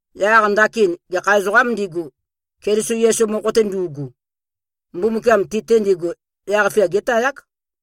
Yaq ndakin, gekha ezoqām ndigu, Keliso Yesu mokho-te ndu꞉gu, Mbumbukiam ti-te ndigu yaq-fia gétayák.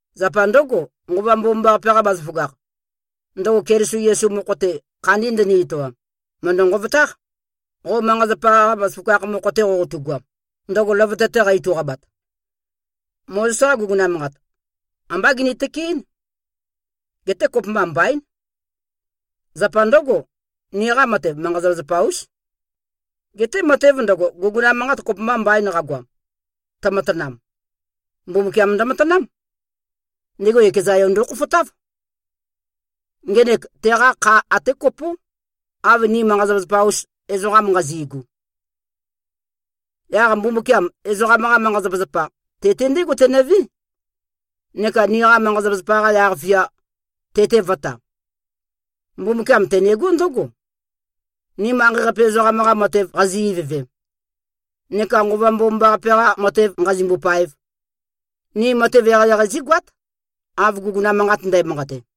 Zapa ndǿgo, Nqova Mbomambaqape-qa bazaføgakh, ndøgo Keliso Yesu mokho-te, khandi ndøni-etoam, mø̀ndø-nqovotáq, qo manqa-zapa-qa bazaføgakh mokho-te qoqotugoam, ndøgo løvøte-te qa-ituqabat. Mozes-qa guguna manqat, ambá gini-tøkeɨ́n. Geté kopømba mbaín. Zapa ndǿgo, niqa matev, manqa-zapazapa-ús. Geté matev ndøgo, guguna manqat kopømba mbain qagoam, tømatanam, Mbumbukiam ndømatanám. Ndego ekeza Yo ndokhofotáv. Ngenek, teqa kha até kopó, av ni manqa-zapazapa-us ezoqam nqazi꞉gu. Yaq Mbumbukiam, ezoqam-qa manqa-zapazapa, te-te ndégo tenøvé, neka niqa manqa-zapazapa-qa yaq-fia, te-te vø̄ta. Mbumbukiam tenegó ndǿgo: Ni manqei-qape ezoqam-qa matev qazi-ivøvem, neka Nqova Mbomambaqape-qa matev nqazimbo-paev, ni matev eqeieqei zígoát, av guguna manqat ndæmanqate.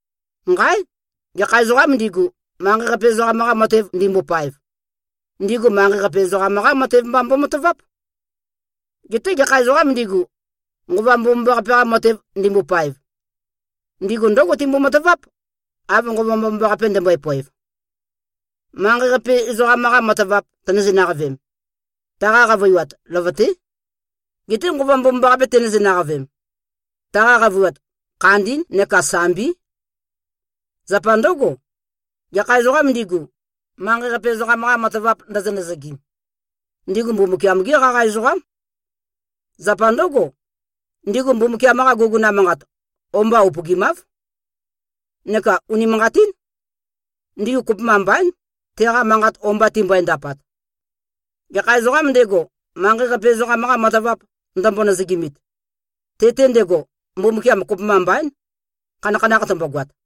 Nqáe! Gekha ezoqām ndigu, manqei-qape ezoqam-qa matev ndimbopaev, ndigu manqei-qape ezoqam-qá matev mba mbomataváp. Geté gekha ezoqām ndigu, Nqova Mbomambaqape-qa matev ndimbopaev, ndigu ndǿgo timbo-mataváp, av Nqova Mbomambaqape ndømbøe-poev. Manqei-qape, ezoqam-qa matavap tønøzeinaqavem, taqa qavøiwat, løvøté. Geté Nqova Mbomambaqape tenøzeinaqavem, taqa qavøiwat, khandí neka sambí. Zapa ndǿgo, gekha ezoqām ndigu, manqei-qape ezoqam-qa matavap ndøzø-nøzøgim, ndigu Mbumbukiam-gí qaqa ezoqám. Zapa ndǿgo, ndigu Mbumbukiam-qa guguna manqat o-mba upøgimáv. Neka unimanqatín. Ndigu kopømba mbaín, teqa manqat o-mba timbøe-ndapat. Gekha ezoqām ndego, manqei-qape ezoqam-qa matavap ndømbo-nøzøgimit, te-te ndego, Mbumbukiam kopømba mbaín, khanakhanakh tømbogoat.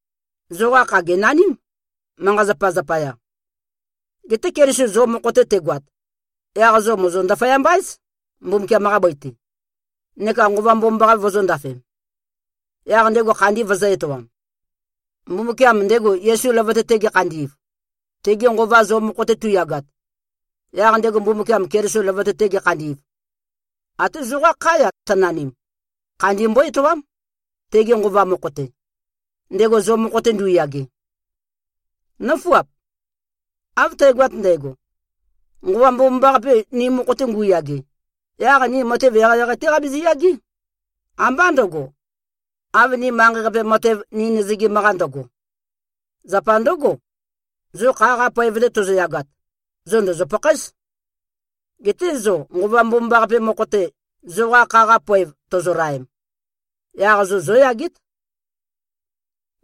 Zoqa kha gènaním, manqa-zapa zapaya. Geté Keliso zo mokho-te tegoat, yaq zo mòzo-ndaføyamba-éz, Mbumbukiam-qa bøi-te, neka Nqova Mbomambaqape vozōndafem, yaq ndego khandi vøzø̄-etoam. Mbumbukiam, ndego Yesu løvøte-te gekhandi꞉v, tege Nqova zo mokho-te tu꞉yagat, yaq ndego Mbumbukiam, Keliso løvøte-te gekhandi꞉v, até zoqá khá-ya tønanim, khandi mbó-etoám, tege Nqova mokho-te, ndego zo mokho-te ndu꞉yage. Nǿfuap! Av tægoat ndægo, Nqova Mbomambaqape ni mokho-te ngu꞉yage, yaq ni matev eqeieqei-té qabizi-yagé, ambá ndø̄go, av niqa manqei-qape matev ni nøzøgim-qa ndøgo. Zapa ndǿgo, zo kha-qa poev-te tozoyagat, zo ndòzo-pakhaéz. Geté zo Nqova Mbomambaqape mokho-te, zoqa kha-qa poev tozolaem, yaq zo zóyagét.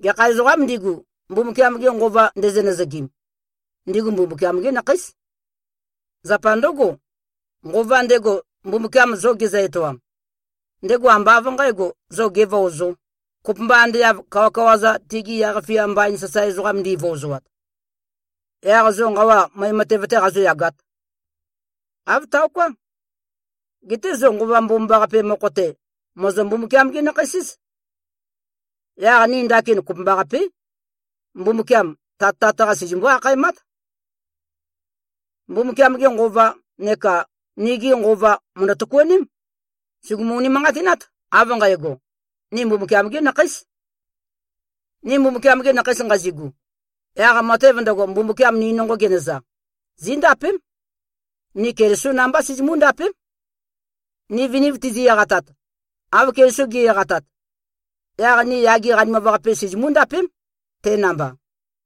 Gekha ezoqām ndigu, Mbumbukiam-ge Nqova ndezø-nøzøgim, ndigu Mbumbukiam-gí nakheís. Zapa ndǿgo, Nqova ndego, Mbumbukiam zo gezø-etoam, ndego ambá av nqǣgo, zo gevøozō, kopømba ande av kawakawa-za, tigi yaq-fia mbain sasae ezoqam ndivøozoat, yaq zo nqawa møe matev-tē qazōyagāt. Āv taoká. Geté zo Nqova Mbomambaqape mokho-te, mòzo-Mbumbukiam-gí-nakheis-éz. Yaq ni ndakin kopømbaqapé, Mbumbukiam, Tat Tat-qa sizimbó-akhaemát. Mbumbukiam-ge Nqova neka nigi nqova mø̀ndø-tøkuaném. Sùgumu-unimanqatinát, av nqægo: Ni Mbumbukiam-gí nakheís. Ni Mbumbukiam-gi nakheis nqazigu, yaq matev ndøgo, Mbumbukiam ni nonqo genøza, zíndapém. Ni Kelisó namba sizimú-ndapém. Ni viniv tizi-eqatat, av Keliso ge꞉-eqatat, yaq ni yage qanimav-qape sizimú-ndapém, te namba.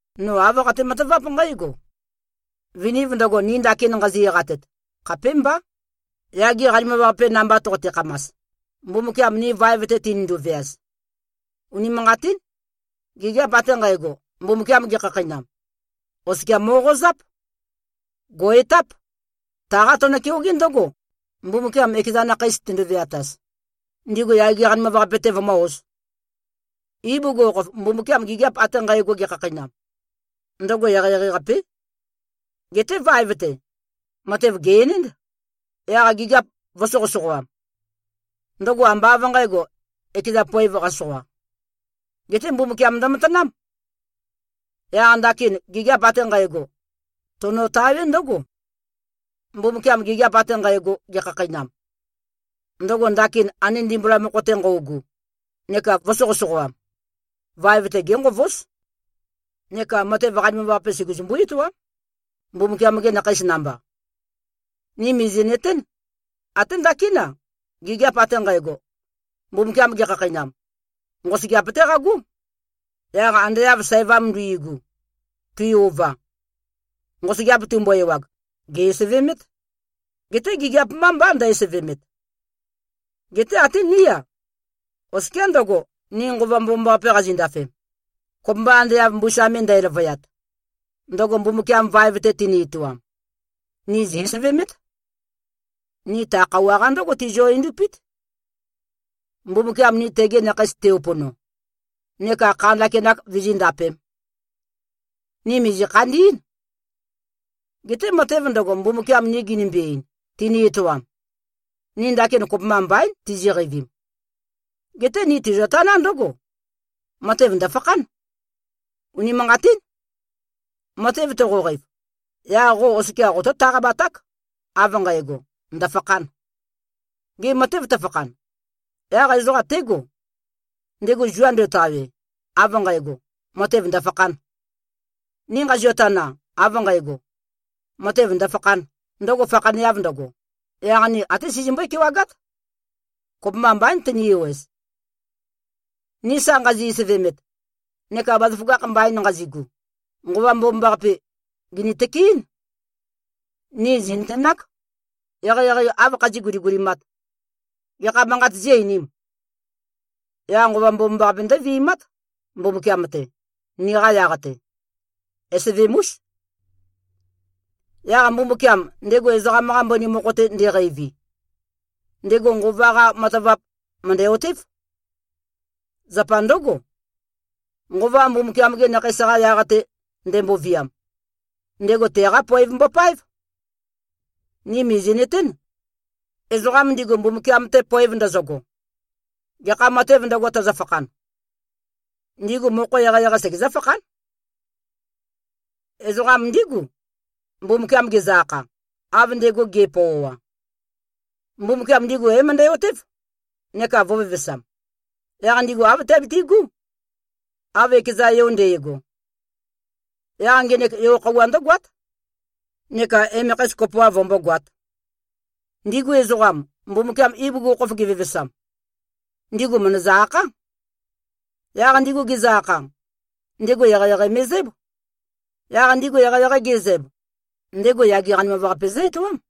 No āv qate-mataváp nqǽgo: Viniv ndøgo, ni ndakin nqazi-eqatet, khapémbá, yage qanimav-qape namba toqote-khamas, Mbumbukiam ni vaev-te tinindu-veaz. Unimanqatín. Gigiap ate nqægo, Mbumbukiam gekhakheinam, oskia mo꞉qozáp. Gò꞉-etáp. Taqá tøno-keogé ndǿgo, Mbumbukiam ekeza nakheis tendo-veataz, ndigu yage qanimav-qape-te vømǿ-ōz. Ibugukhokhof, Mbumbukiam gigiap ate nqægo gekhakheinam, ndøgo eqeieqei-qapé. Geté vaev-te, matev gè-enénd, yaq gigiap vø̄soqøsoqoam. Ndøgo ambá av nqǣgo, ekeza poēv, qasoqa. Geté Mbumbukiam ndømatanám. Yaq ndakin gigiap ate nqægo, tonotawé ndǿgo: Mbumbukiam gigiap ate nqægo, gekhakheinam, ndøgo ndakin ande ndimbula mokho-te nqøugu neka vø̄soqøsoqoam, vaev-te génqovóz neka matev qanimav-qape suguzumbú-etoám, Mbumbukiam-gi nakheis namba. Ni mìzi꞉nøtén: Até ndakín-a, gigiap ate nqægo, Mbumbukiam gekhakheinam, nqosøgeap-té qagó. Yaq ande av sævam nduigu, tui-ova, nqosøgeap tumbo-ewag, gè꞉-esevemét. Geté gigiap mbá mbá, ndø-esevemet. Geté até ní-a, oskiá ndøgo, ni Nqova Mbomambaqape qazindafem, kopømba ande av mbusa me ndæløvøyat, ndøgo Mbumbukiam vaev-te teni-etoam, ni zì-esevemét. Ni ta khøuwa-qa ndǿgo tizio-endupít, Mbumbukiam ni tegi nakheis te-upono neka kha ndakinak vizíndapēm. Ni mìzi-khandí꞉n. Geté matev ndøgo, Mbumbukiam ni ginimbi-ein, tini-etoam, ni ndakin kopømba mbaín, tiziqeivim. Geté ni tizio-taná ndǿgo: Matev ndø̀fakhán. Unimanqatín. Matev toqoqeiv, yaq qo oskia qotó-taqabaták, av nqægo, ndøfakhān. Gê, matev tøfakhan, yaq ezoqa tégo, ndego zua ndo꞉tawe av nqægo, matev ndø̀fakhān? Ni nqazio-tana av nqægo, matev ndø̀fakhān, ndøgo fakhaneav ndøgo, yaq ni até sizimbøé-kewagát. Kopømba mbaín tøni-ewez. Ni sa nqazi-esevemet neka bazaføgakh mbain nqazigu, Nqova Mbomambaqape, gìni-tøkeɨ́n. Ni zì꞉nøtenák, eqeieqei āv khazí꞉-guligulimāt. Gekha manqāt zí-einīm? Yaq Nqova Mbomambaqape ndøvi꞉mát, Mbumbukiam-te, niqa yaq-te. Esevem-ús. Yaq Mbumbukiam, ndego ezoqam-qa mbøni mokho-te ndeqeivi, ndego Nqova-qa matavap mø̀ndæ-otév. Zapa ndǿgo, Nqova Mbumbukiam-gi nakheis-qa yaq-te ndemboviam, ndego teqá poev mbopáev. Ni mìzi꞉nøtén. Ezoqa ndigu, Mbumbukiam-te poev ndøzøgo, gekha matēv ndøgo, tøzøfakhan, ndigu mokho eqeieqei segezǿ-fakhán. Ezoqam ndígu, Mbumbukiam gezø-akha, av ndego ge꞉pøoa. Mbumbukiam ndigu é-møndæ-otév, neka vø̄vevesam. Yaq ndigu āv tiabiti꞉gú, av ekeza Yo nde꞉go. Yaq ngenek yo-khøuwa ndǿgoát, neka emekheis kopoav vømbógoāt. Ndigu ezoqam, Mbumbukiam ibugukhokhof gevevesam, ndigu mø̀ndøzø-akhá. Yaq ndigu gezø-akha, ndego eqeieqei me꞉zǽb. Yaq ndigu eqeieqei ge꞉zæb, ndego yage qanimav-qape zǿ-etoám.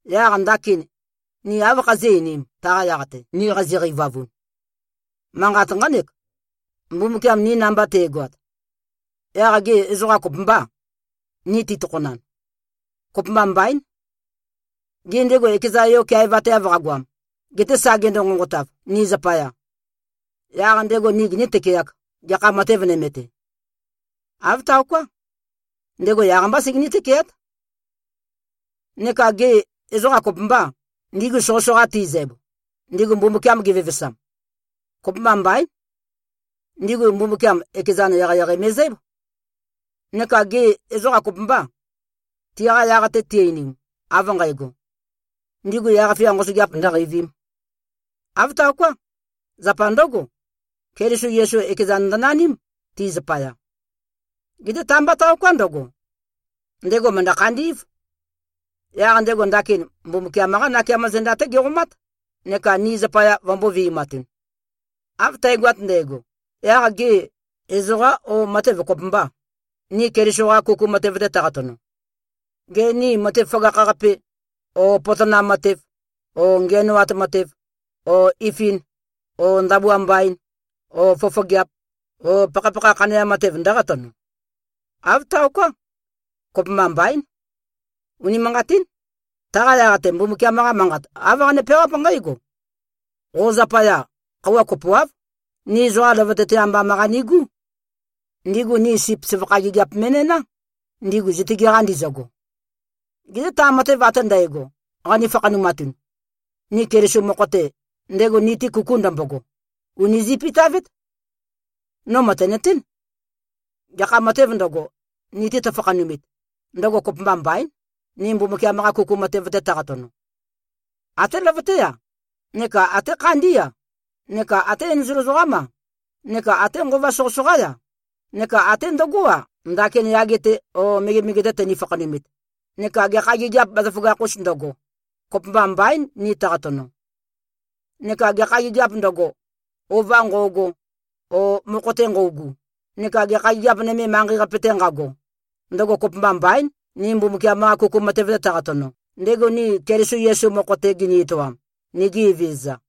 Yaq ndakin, ni áv khazí꞉-einīm, taqa yaq-te, ni qazi-qeivavun? Manqat nqánek: Mbumbukiam ni namba te꞉goat, yaq gê, ezoqa kopømbâ, ni titokhonan? Kopømba mbaín. Gê, ndego ekeza Yo keaevateav qagoam, gete sa gendo-nqonqotav, ni zapaya, yaq ndego ni giní-tøkeāk, gekha matev nøme-te? Āv taoká. Ndego yaq-mbá segení-tøkeát. Neka gê, ezoqa kopømbâ, ndigu soqøsoqa tizæb, ndigu Mbumbukiam gevevesam? Kopømba mbaín. Ndigu, Mbumbukiam ekezan eqeieqei me꞉zǽb. Neka gê, ezoqa kopømbâ, tiqa yaq-te ti-einim av nqægo, ndigu yaq-fia nqosøgeap ndø̄qeivīm. Āv taoká. Zapa ndǿgo, Keliso Yesu ekezan ndønaním, ti zapaya. Geté ta-mbá taoká ndøgo. Ndego mø̀ndø-khandí꞉v. Yaq ndego ndakin Mbumbukiam-qá nakeamo zenda-té geqomát neka ni zapaya vømbō-vi꞉matun. Av tægoat ndægo, yaq gê, ezoqá o matev kopømbâ, ni Keliso-qa kuku matev-te tøqatono? Gê, ni matev føgakh-qape, o potonam matev, o ngiænoat matev, o ifin, o ndabua mbain, o fofogeap, o pakhapakha khaneam matev ndǿqatono? Āv taoká. Kopømba mbaín. Unimanqatín. Taqa yaq-te, Mbumbukiam-qa Manqat, āv qane-peawáp nqǽgo, “Qo zapaya, khøuwa kopoáv, ni ezoqa løvøte-te ambam-qa nigú. Ndigu ni sip søvakha gigiap me꞉næná, ndigu zitøge-qa ndizøgo.” Geté ta matev ate ndægo, qani-fakhanumatun, ni Keliso mokho-te, ndego ni-te kuku ndømbogo, ùni zi꞉pitavét. No mø̀tenøtén. Gekha matēv ndøgo, ni-te tøfakhanumit, ndøgo kopømba mbaín, ni Mbumbukiam-qa kuku matev-te tøqatono. Até løvøté-a, neka até khandí-a, neka até enzol ezoqám-a, neka até nqova soqøsoqá-ya, neka até ndøgó-a, ndakin yage-te o megemege-te tøni-fakhanumit, neka gekha gigiap bazaføgakh-ūs ndøgo, kopømba mbaín, ni tøqatono. Neka gekha gigiāp ndøgo, ova nqo꞉go o mokho-te nqøugu, neka gekha gigiap nømē manqei-qape-te nqago, ndøgo kopømba mbaín, ni Mbumbukiam-qa kuku matev-te tøqatono, ndego ni Keliso Yesu mokho-te gini-etoam, nigi Evezøza.